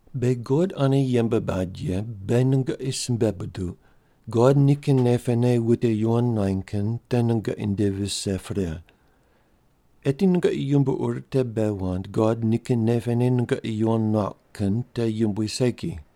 Beghi God ane yembe bad ye beghi nungoqi simbe buduq, God nikin nei pene wute yuwon nuany kin te nungoqi nde vise pre. Eti nungoqi yumbo ur te bei wand God nikin nei pene nungoqi yuwon nuauq kin te yumbui segi.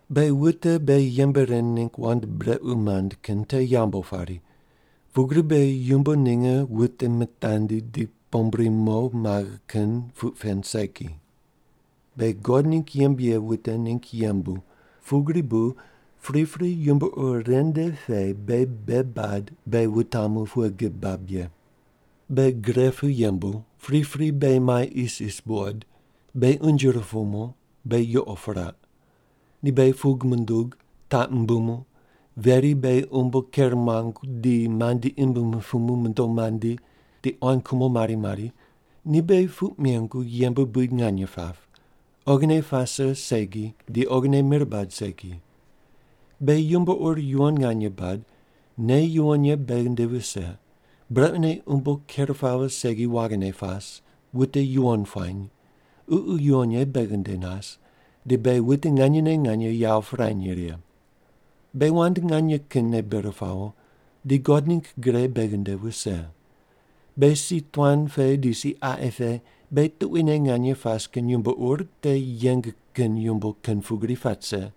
Beghi wute beghi yembe ren ningg wand brequ mand kin te yambu pari, pugri bu beghi yumbo ninge wute mitandi di pombri mo maghe kin puq pen segi. Beghi God ningg yembe ye wute ningg yembu pugri bu pripri yumbo ur ren nde pe beghi bei bad beghi wutamu pughe gib bab ye: Beghi gre pu yembu, pripri beghi mai isis buqod, beghi unje rupumu, beghi yuqo piraq. Ni beghi pug mundug, taq mumbumu, veri beghi umbo ker muangu di mandi imb mupumu mondo mandi di quan kumo mari mari, ni beghi puq mengu yembe buid nganye pap, oghine pase segi di oghine mir bad segi. Beghi yumbo ur yuwon nganye bad, nei yuwon ye beghi nde vise, brequne umbo ker pawo segi waghine pas, wute yuwon puany, Ququ Yuwon Ye beghi nde nas, di beghi wute nganyene nganye yawo pirany righe. Beghi wand nganye kinne bir pawo, di God ningg gre beghi nde vise. Beghi si tuan pe di si qaqi pe beghi tuquine nganye pas kin yumbo ur te yeng kin yumbo kin pugri pat rise.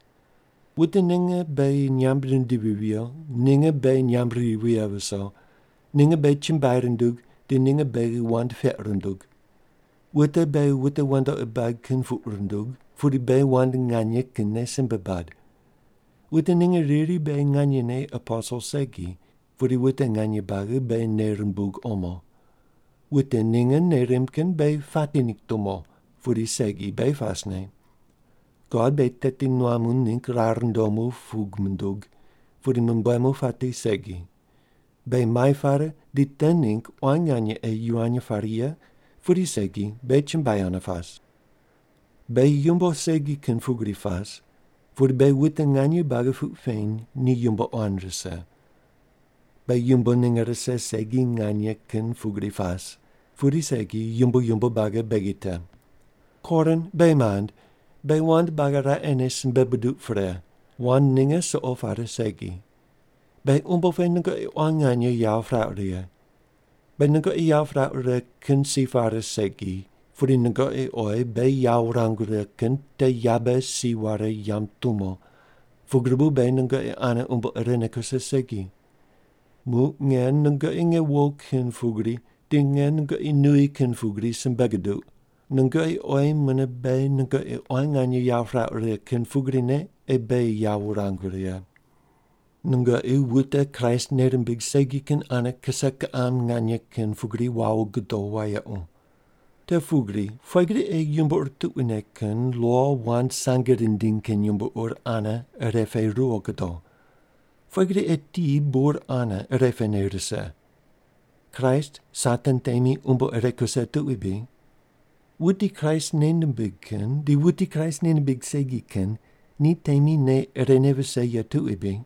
Wute ninge beghi nyamb rindivi viyo, ninge beghi nyamb ri vighe viso, ninge beghi chumbuai rundug di ninge beghi wand peq rundug. Wute beghi wute wandoqi bad kin puq rundug, pudi beghi wand nganye kinne simbe bad. Wute ninge riri beghi nganyene aposel segi, pudi wute nganye buagi beghi nei rumbug omo. Wute ninge nei rimb kin beghi pati ningg tumo, pudi segi beghi pasne. God beghi teti nuamu ningg rar ndomu pug mundug, pudi mumbuemu pati segi. Beghi mai pare di te ningg quan nganye ei yivany pare ye pudi segi, beghi chumbuai ane pas. Beghi yumbo segi kin pugri pas, pudi beghi wute nganye buagi puq peny ni yumbo quan rise. Beghi yumbo ninge rise segi nganye kin pugri pas, pudi segi yumbo yumbo buagi beghi te. Korin, beghi mand, beghi wand buagi raqene simbe buduq pre, wand ninge suqo pare segi. Beghi umbo pe nungoqi quan nganye yawo pirauq righe. Beghi nungoqi yawo pirauq righe kin si pare segi, pudi nungoqi oyi beghi yawo wurangu righe kin te yabe si ware yamb tumo pugri bu beghi nungoqi ane umbo irene kuse segi. Muq nge nungoqi nge wo kin pugri di nge nungoqi nuyi kin pugri simbe guduq, nungoqi oyi mune beghi nungoqi quan nganye yawo pirauq righe kin pugrine ei beghi yawo wurangu righe. Nungoqi wute Kraist nei rimbig segi kin ane kise kiqam nganye kin pugri wawo gudo wayequ. Te pugri pughe gri ei yumbo ur tuquine kin lo wand sange rindiny kin yumbo ur ane irepe ruwo gudo? Pughe gri ei ti bur ane irepene rise? Kraist Satan temi umbo ire kuse tuqui bri? Wuti Kraist nei nimbig kin di wuti Kraist nei nimbig segi kin ni temi nei irene vise ye tuqui bri?